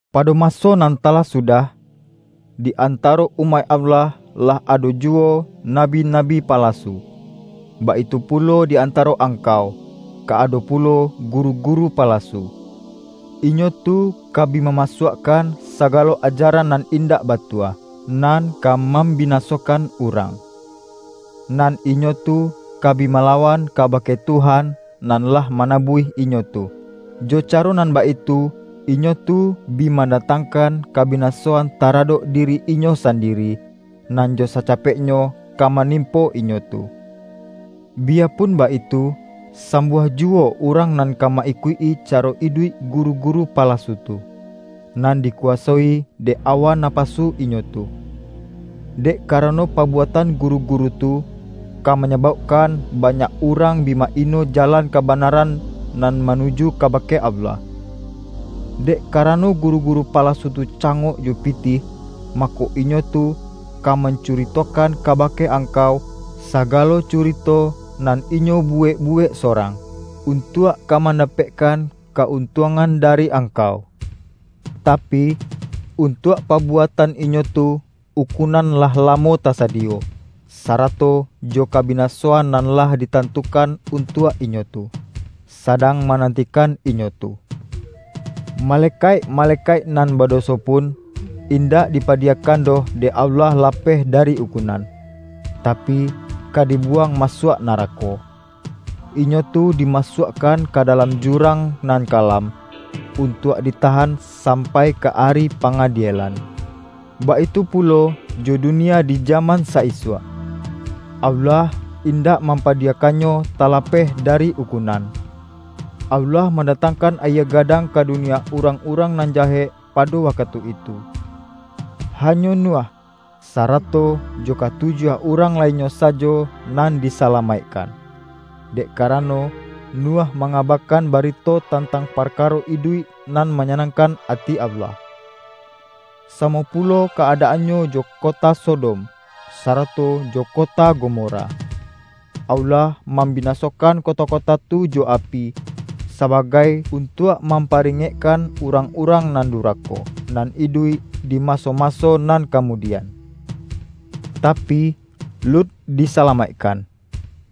Pado maso nan talah sudah, di antaro umaik Allah lah ado ju-wo nabi-nabi palasu. Baitu pulo di an-taro angkau, ka ado pulo guru-guru palasu. Inyo tu ka bi mamasuakkan sagalo ajaran nan indak batua, nan ka mambinasokan urang. Nan inyo tu ka bi malawan kabake Tuhan nan lah manabuih inyo tu. Jo caro nan baitu, inyo tu bi mandatangkan kabi-nasoan taradok diri inyo sandiri, nan jo sacapeknyo ka manimpo inyo tu. Biyapun baitu, sambuah juwo urang nan ka ma-ikuik-i caro iduik guru-gu-ru palasu tu, nan dikuwasoi dek awa napasu inyo tu. Dek karano pabuatan guru-guru tu, ka manyabaukkan ba-nyak urang bi ma-ino Jalan Kabana-ran, nan manuju kabake Allah. Dek karano guru-guru palasu tu cangok jo pitih, mako, inyo tu ka mancuri-tokan kabake angkau, sagalo curito nan inyo buwek-buwek sorang, un-tuak ka mandapekkan ka-untuangan dari angkau. Tapi, untuak pabuatan inyo tu ukunan lah lamo tasadiyo, sa-rato jo kabinasoan nan lah ditantu-kan untuak inyo tu, sadang mananti-kan inyo tu. Malekaik-malekaik nan bado-so pun, indak dipadiyakan doh dek Allah lapeh dari ukunan, tapi, ka di-buwang masuak narako. Inyo tu di-masuakkan ka dalam jurang nan ka-lam, untuak ditahan sampai ka Ari Pangadielan. Baitu pulo jo dunia di jaman sa-isuak, Allah indak mam-padiyakannyo talapeh dari ukunan. Allah mandatangkan ayie gadang ka dunia urang-urang nan jahek pado wakatu itu. Hanyo Nuh, sarato jo ka tujuah urang lainnyo sajo nan disala-maikkan, dek karano, Nuh mangaba-kan barito tantang parkaro iduik nan manyanangkan ati Allah. Samo pu-lo ka-adaannyo jo kota Sodom, sarato jo kota Gomora: Allah mambinasokan kota-kota tu jo api, sabagai untuak mamparingekkan urang-urang nan durako, nan iduik di maso-maso nan kamudian. Tapi, Lut disalamaikkan,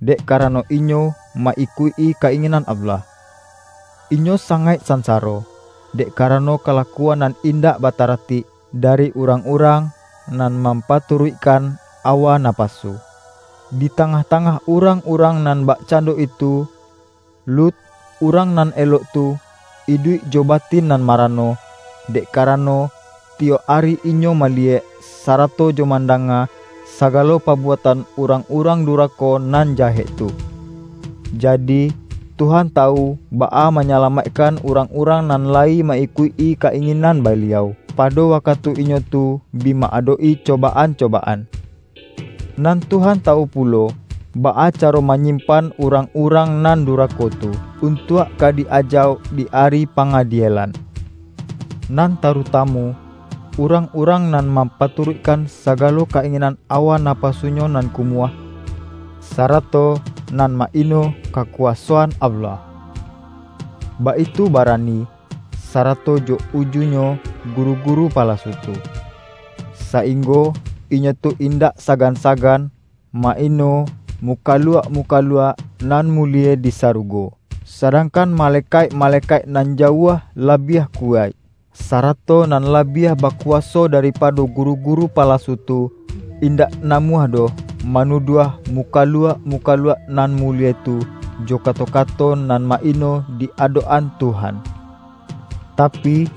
dek karano inyo ma-ikuik-i ka-ingin-an Allah; inyo sangaik sansaro, dek karano kalakuan nan indak batara-tik, dari urang-urang nan mampatu-ruikkan awa napasu. Di tangah-ta-ngah urang-urang nan bakcando itu, Lut, urang nan elok tu, iduik jo ba-tin nan marano, dek karano, tiyok ari inyo maliyek, sarato jo mandanga, sagalo pabuatan urang-urang durako nan jahek tu. Jadi, Tuhan tawu baa manyalamaikkan urang-urang nan la-yi ma-ikuik-i ka-inginan Baliau, pado wakatu inyo tu bi ma-adok-i cobaan-cobaan. Nan Tuhan tawu pulo, baa caro manyimpan urang-urang nan du-rako tu, untuak ka di-ajauk di Ari Pa-ngadielan, nan tarutamu, urang-urang nan mampaturuikkan sagalo ka-inginan awa napasunyo nan ku-muah, sarato nan ma-ino kakuwaso-an Allah. Baitu barani, sarato jo ujunyo guru-guru palasu tu, sainggo inyo tu indak sagan-sagan, ma-ino mukaluak-mu-kaluak nan mulie di sarugo! Sa-dangkan malekaik-malekaik nan ja-uah labiah kuwaik, sarato nan labiah bakuwaso daripado guru-guru palasu tu, indak namuah doh manuduah mu-kaluak-mukaluak nan mulie tu, jo ka-to-kato nan ma-ino di adok-an Tuhan. Tapi,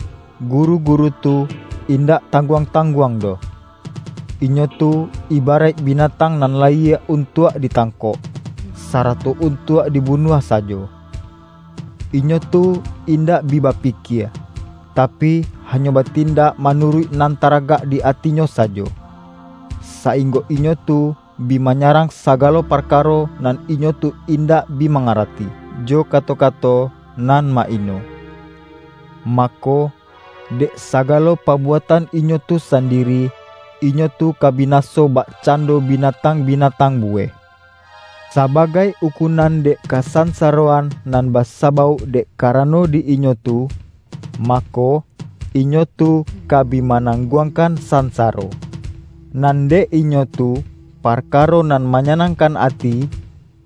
guru-guru tu, indak tang-guang-tangguang doh! Inyo tu ibaraik binatang nan layie untuak ditangkok, sarato untuak dibunuah sajo. Inyo tu indak bi bapikie, tapi hanyo batin-dak manuruik nan tagarak di atinyo sajo, sainggo inyo tu bi manyarang sagalo parkaro nan inyo tu indak bi mangarati, jo kato-kato nan ma-ino. Mako, dek sagalo pabuatan inyo tu sandiri, inyo tu ka binaso bakcando binatang-binatang buweh. Saba-gai ukunan dek kasansaroan nan ba-sabauk dek karano di inyo tu, mako, inyo tu ka bi manangguangkan sansa-ro. Nan dek inyo tu, parkaro nan ma-nyanangkan ati,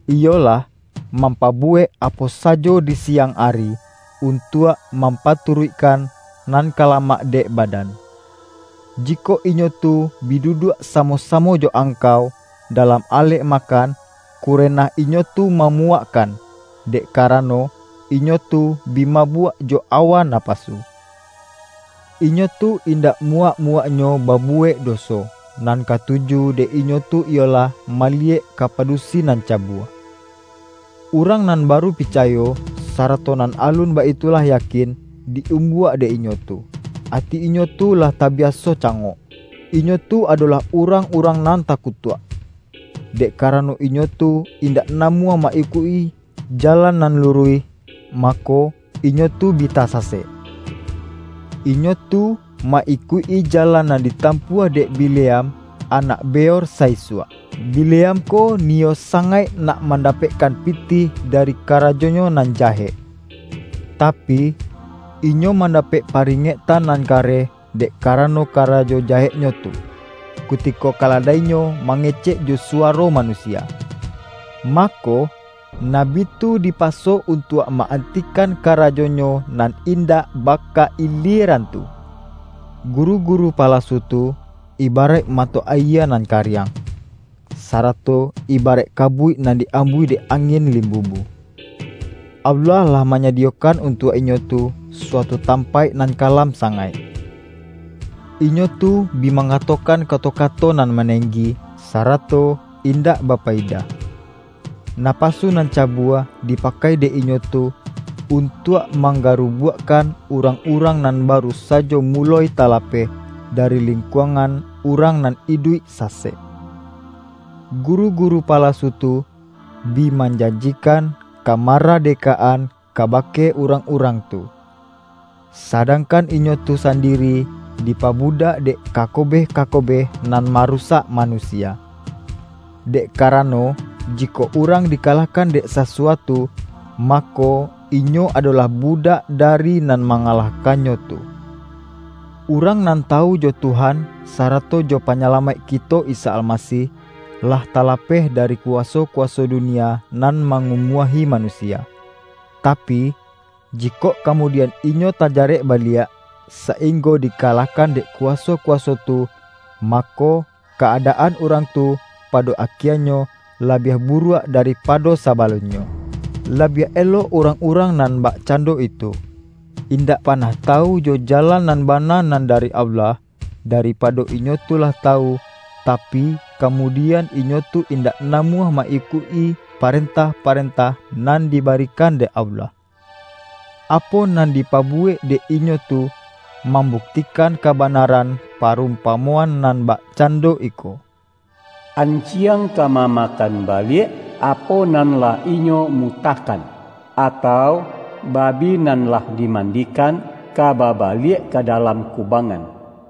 iyolah, mampabuwek apo sajo di siang ari, untuak mampa-turuikkan nan ka lamak dek badan. Jikok inyo tu bi duduak samo-samo jo angkau, dalam alek makan, kure-nah inyo tu mamuwakkan, dek kara-no, inyo tu bi mabuak jo awa napasu. Inyo tu indak muwak-muwaknyo babuwek doso, nan katuju dek inyo tu iyolah maliyek ka padusi nan ca-bua. Urang nan baru picayo, sarato nan alun baitu lah yakin, di-umbuak dek inyo tu. Ati inyo tu lah tabiaso ca-ngok. Inyo tu adolah urang-urang nan takutuak! Dek karano inyo tu indak namuah ma-ikuik-i jalan nan luruih, mako, inyo tu bi tasasek. Inyo tu ma-ikuik-i jalan nan ditampuah dek Bi-leam anak Beor sa-isuak. Bileam ko niyo sangaik nak mandapekkan pi-tih dari karajonyo nan jahek. Tapi, inyo mandapek paringektan nan ka-reh, dek karano karajo jaheknyo tu, kutiko kaladainyo mangecek jo suwa-ro manusia. Mako, nabi tu dipaso un-tuak ma-antikan karajonyo nan indak baka-ilieran tu. Guru-guru palasu tu, ibaraik ma-to ayie nan kariang, sarato ibaraik ka-buik nan di-ambuih dek angin limbu-bu. Allah lah manyadiyokan untuak inyo tu, suatu tampaik nan kalam sa-ngaik. Inyo tu bi mangatokan kato-kato nan manenggi, sarato indak ba-payidah; napasu nan cabua, dipakai dek inyo tu, untuak manggarubuakkan urang-urang nan baru sajo mu-loi talapeh, dari lingkuangan urang nan iduik sasek. Guru-guru palasu tu, bi manjanjikan kamaradekaan ka-bake urang-urang tu, sadangkan inyo tu sandiri dipabudak dek kakobeh-kakobeh nan marusak manusia. Dek karano, jikok urang dikalahkan dek sasuatu, mako, inyo adolah budak da-ri nan mangalahkannyo tu. Urang nan tawu jo Tuhan sarato jo Panya-lamaik kito Isa Almasih, lah talapeh dari kuwaso-kuwaso dunia nan ma-ngumuahi manusia. Tapi, jikok ka-mudian inyo tajarek baliak, sainggo dikalahkan dek kuwaso-kuwaso tu, mako, ka-adaan urang tu pado akie-nyo, labiah buruak daripado sabalun-nyo. Labiah elok urang-urang nan bakcando itu, indak panah tawu jo ja-lan nan bana nan dari Allah, daripa-do inyo tu lah tawu, tapi, kamudian inyo tu indak namuah ma-ikuik-i, pa-rentah-parentah nan dibarikan dek Allah. Apo nan dipabuwek dek inyo tu, mambuktikan kabanaran pa-rumpamoan nan bakcando iko,”An-jiang ka mamakan baliak, apo nan lah inyo mutahkan,” atau,”Babi nan lah dimandikan, ka babaliak ka dalam kubangan.”